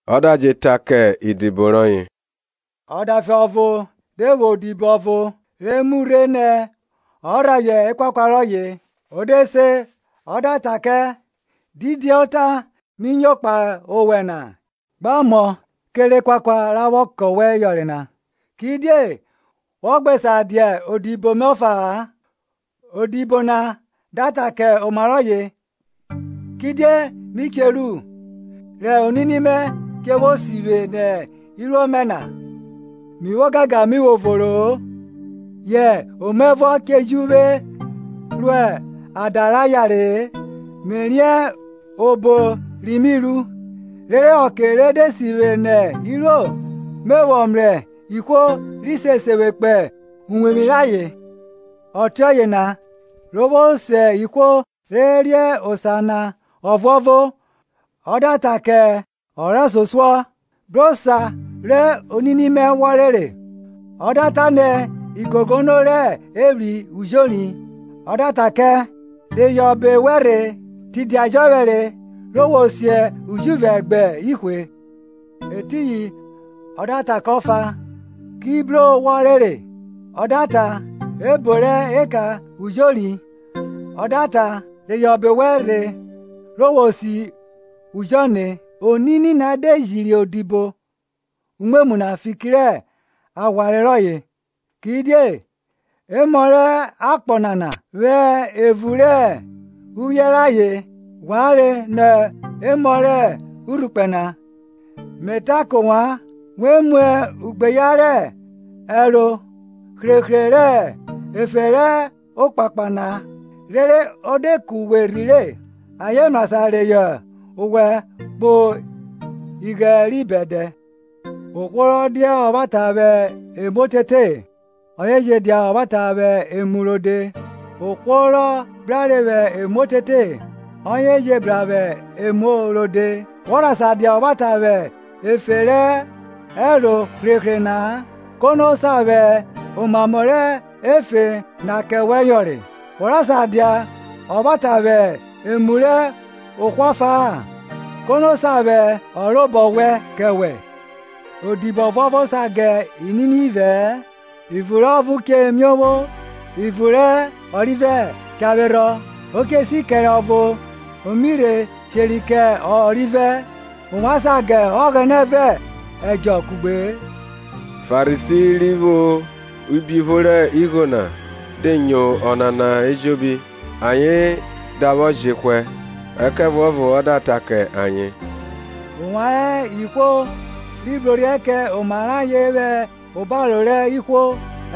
Ọ da je ta kẹ idibo rọye, Ọdafe ọvo de vwo odibo ọvo, re mu rhe nẹ ọ rhaphiẹ ekuakua rọye. O de se ọ da ta kẹ, Didi ota mi nyo kpahe owẹ na? Gbe mo kere ekuakua ra vwọ kẹ wẹ yọnre na, kidie wọ gbe sa dia odibo mẹ ọfa-a. Odibo na da ta kẹ oma rọye, Kidie mi che ru, rẹ onini mẹ che vwo si vwe nẹ iruo mẹ na? Mi vwo ogangan mi vwo voro-o, yẹ omaẹvuọ che ju vwe ro ada ra yare-e. Me riẹn obo ri mi ru, rere ọke re de si vwe nẹ iruo me vwọ mrẹ ihwo ri se vwe kpo uwevwi rayen? Ọtiọye na, ro vwo se ihwo re re osa na ọvuọvo, ọ da ta kẹ ọ rẹsosuọ, Bro osa rẹ onini mẹ wọ rere? Ọ da ta nẹ, igogono rẹ evwri ujori. Ọ da ta ke, Reyọ ọbe wẹ rhe, tidia jọphẹre re wo si ujuvẹ gbe ihwe. Etiyin ọ da ta kẹ ọfa, ki bro wọ rere? Ọ da ta, ebo rẹ eka ujori. Ọ da ta, Reyọ ọbe wẹ rhe, re wo si ujọne. Onini na de jiri odibo umwemwu na fiki rẹ aghwanre rọye; kidie emọ rẹ akpọ nana vwẹ evun rẹ uvwiẹ rayen ghwanre nọ emọ rẹ urhukpẹ na. Me ta kẹ ovwan, we mu ugbeyan rẹ ẹro hrehre rẹ efe rẹ okpakpa na, rere o de ku we rhire ayen mrasan reyọ owẹ kpo ighẹn ri bẹdẹ. Ohwo rọ dia ọvwata vwe ẹmu otete, ọye je dia ọvwata vwẹ emu rode; ohwo rọ brare vwẹ emu otete, ọye je bra vwẹ emu rode. Wọ rha ka dia ọvwata vwẹ efe rẹ ẹro hrehre na-a, kono sa vwẹ omamọ rẹ efe na kẹ wẹ yọnre? Wọ rha sa dia ọvwata vwẹ emu rẹ ohwo ọfa-a, kono sa vwẹ ọ robo wẹn kẹ wẹ? Odibo ọvuọvo sa ga inini ivẹ-ẹ; ivun rẹ ọvo che miovwo ivun rẹ ọrivẹ cha vwerhọ, o che si kere ọvo o mi rhe sheri kẹ ọrivẹ. Ovwan sa ga Ọghẹnẹ vẹ ẹdjọ kugbe-e. Farisi ri vwo ubiupho rẹ igho na, de nyo ọnana ejobi, ayen da vwọ jehwẹ. Ẹkẹvuọvo ọ da ta kẹ ayen, Ovwan hẹ ihwo ri brorhiẹ kẹ oma rẹ ayen vwẹ obaro rẹ ihwo,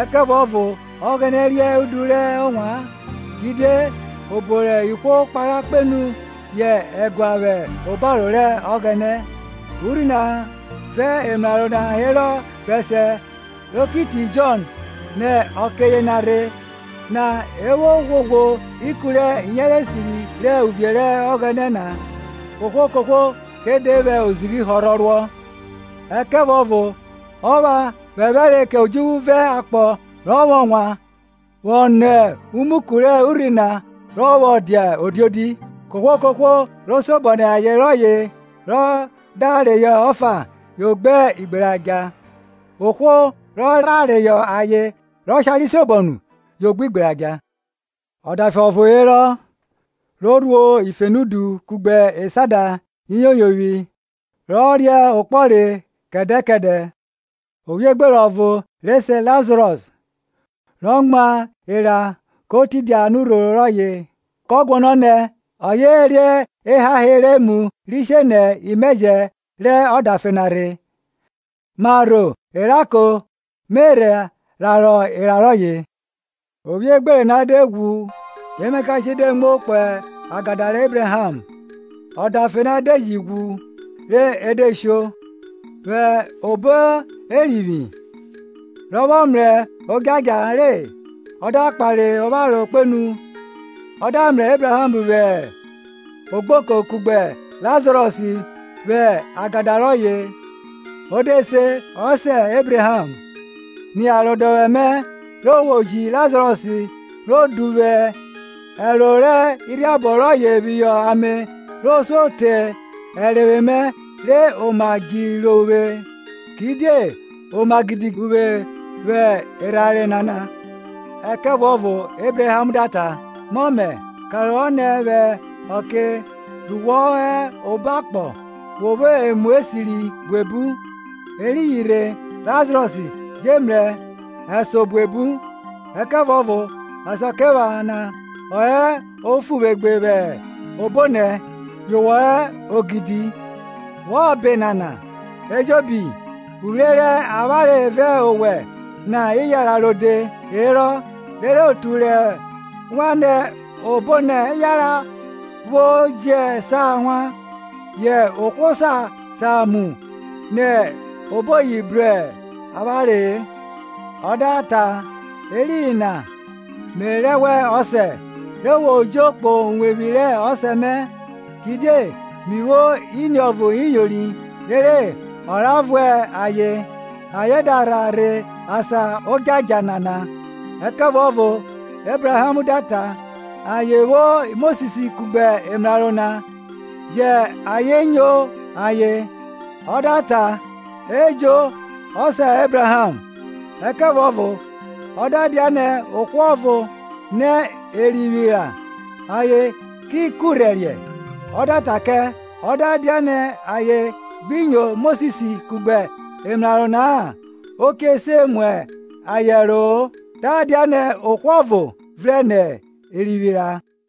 ẹkẹvuọvo Ọghẹnẹ riẹn udu rẹ ovwan; kidie obo rẹ ihwo kpara kpenu yẹ ẹgua vwẹ obaro rẹ Ọghẹnẹ. Urhi na vẹ emraro na herọ bẹsiẹ ro ki rhi te Jọn; nẹ ọke yena rhe na e vwo ghwoghwo ikun rẹ iyenre esiri rẹ uvie rẹ Ọghẹnẹ na, kohwo kohwo ke de vwẹ ozighi họrhọ ruọ. Ẹkẹvuọvo ọ pha phẹphẹre kẹ odjuvwu vẹ akpọ rọ vwọ wan, vwọ nọ umuku rẹ urhi na rọ vwọ dia odiodi. Kohwo kohwo ro siobọ nẹ aye rọye rọ da reyọ ọfa yo gbe igberadja, ohwo rọ rha reyọ aye rẹ ọshare siobọ nu yo gbe igberadja. Ọdafe ọvo herọ, ro rhuo ifenudu kugbe esada iyoyovwi rọ ria okpọre kẹdẹ kẹdẹ. Ovwiogbere ọvo re se Lazarọs, ro mwa era ko tidia anurhoro rọye. kọ guọnọ nẹ ọye re ehahe rẹ emu ri she nẹ imẹjẹ rẹ ọdafe na rhe; marho eranko me rhe rarọ era rọye. Ovwiogbere na de ghwu emakashe de muo kpo agada rẹ Ebraham. Ọdafe na de ji ghwu rhe e de sho; vwẹ obo Erivwi, rọ vwọ mrẹ odjadja re, ọ da kpare opharo kpenu, ọ da mrẹ Ebraham vwẹ ogboko kugbe Lazarọs vwẹ agada rọye. Ọ de se, Ọsẹ, Ebraham, ni arodọvwẹ mẹ re wo ji Lazarọs ro duvwu ẹroro rẹ urhiabọ rọye phihọ ame ro suo re ẹrenvwe mẹ re oma djiro uvwe; kidie oma gidi uvwe vwẹ erhanre nana. Ẹkẹvuọvo Ebraham da ta, Mọmẹ, karohọ nẹ vwẹ ọke ru wọ vwọ hẹ obo akpọ wo vwo emu esiri buebu, eriyin rhe Lazarọs je mrẹ ẹnso buebu; ẹkẹvuọvo Asakiephana ọ hẹ ofuvwegbe vwẹ obonẹ, yo wẹ hẹ ogidi. Vwọ ba enana ejobi, uvwre rẹ avwanre vẹ owẹ na iyara rode herọ, rere otu rẹ wan nẹ obonẹ yanran vwo jẹ sa wan, yẹ ohwo sa samu nẹ oboyi bru avwanre-e. Ọ da ta, Etiyin na me rẹ wẹ, ọsẹ, re wo jo kpo uwevwi rẹ ọsẹ mẹ, kidie mi vwo iniovo iyori, rere ọ ra vuẹ ayen, ayen da rha rhe asan odjadja nana. Ẹkẹvuọvo Ebraham da ta, Ayen vwo Mosis kugbe emraro na; jẹn ayen nyo ayen. Ọ da ta Ẹjo, ọsẹ Ebraham; ẹkẹvuọvo ọ da dianẹ ohwo ọvo nẹ erivwi ra, ayen ki kurhẹriẹ. Ọ da ta kẹ, Ọ da dianẹ ayen gbi nyo Mosis kugbe emraro na-a, o che se mu ayen ẹro-o ọ da dianẹ ohwo ọvo vrẹn nẹ erivwi ra.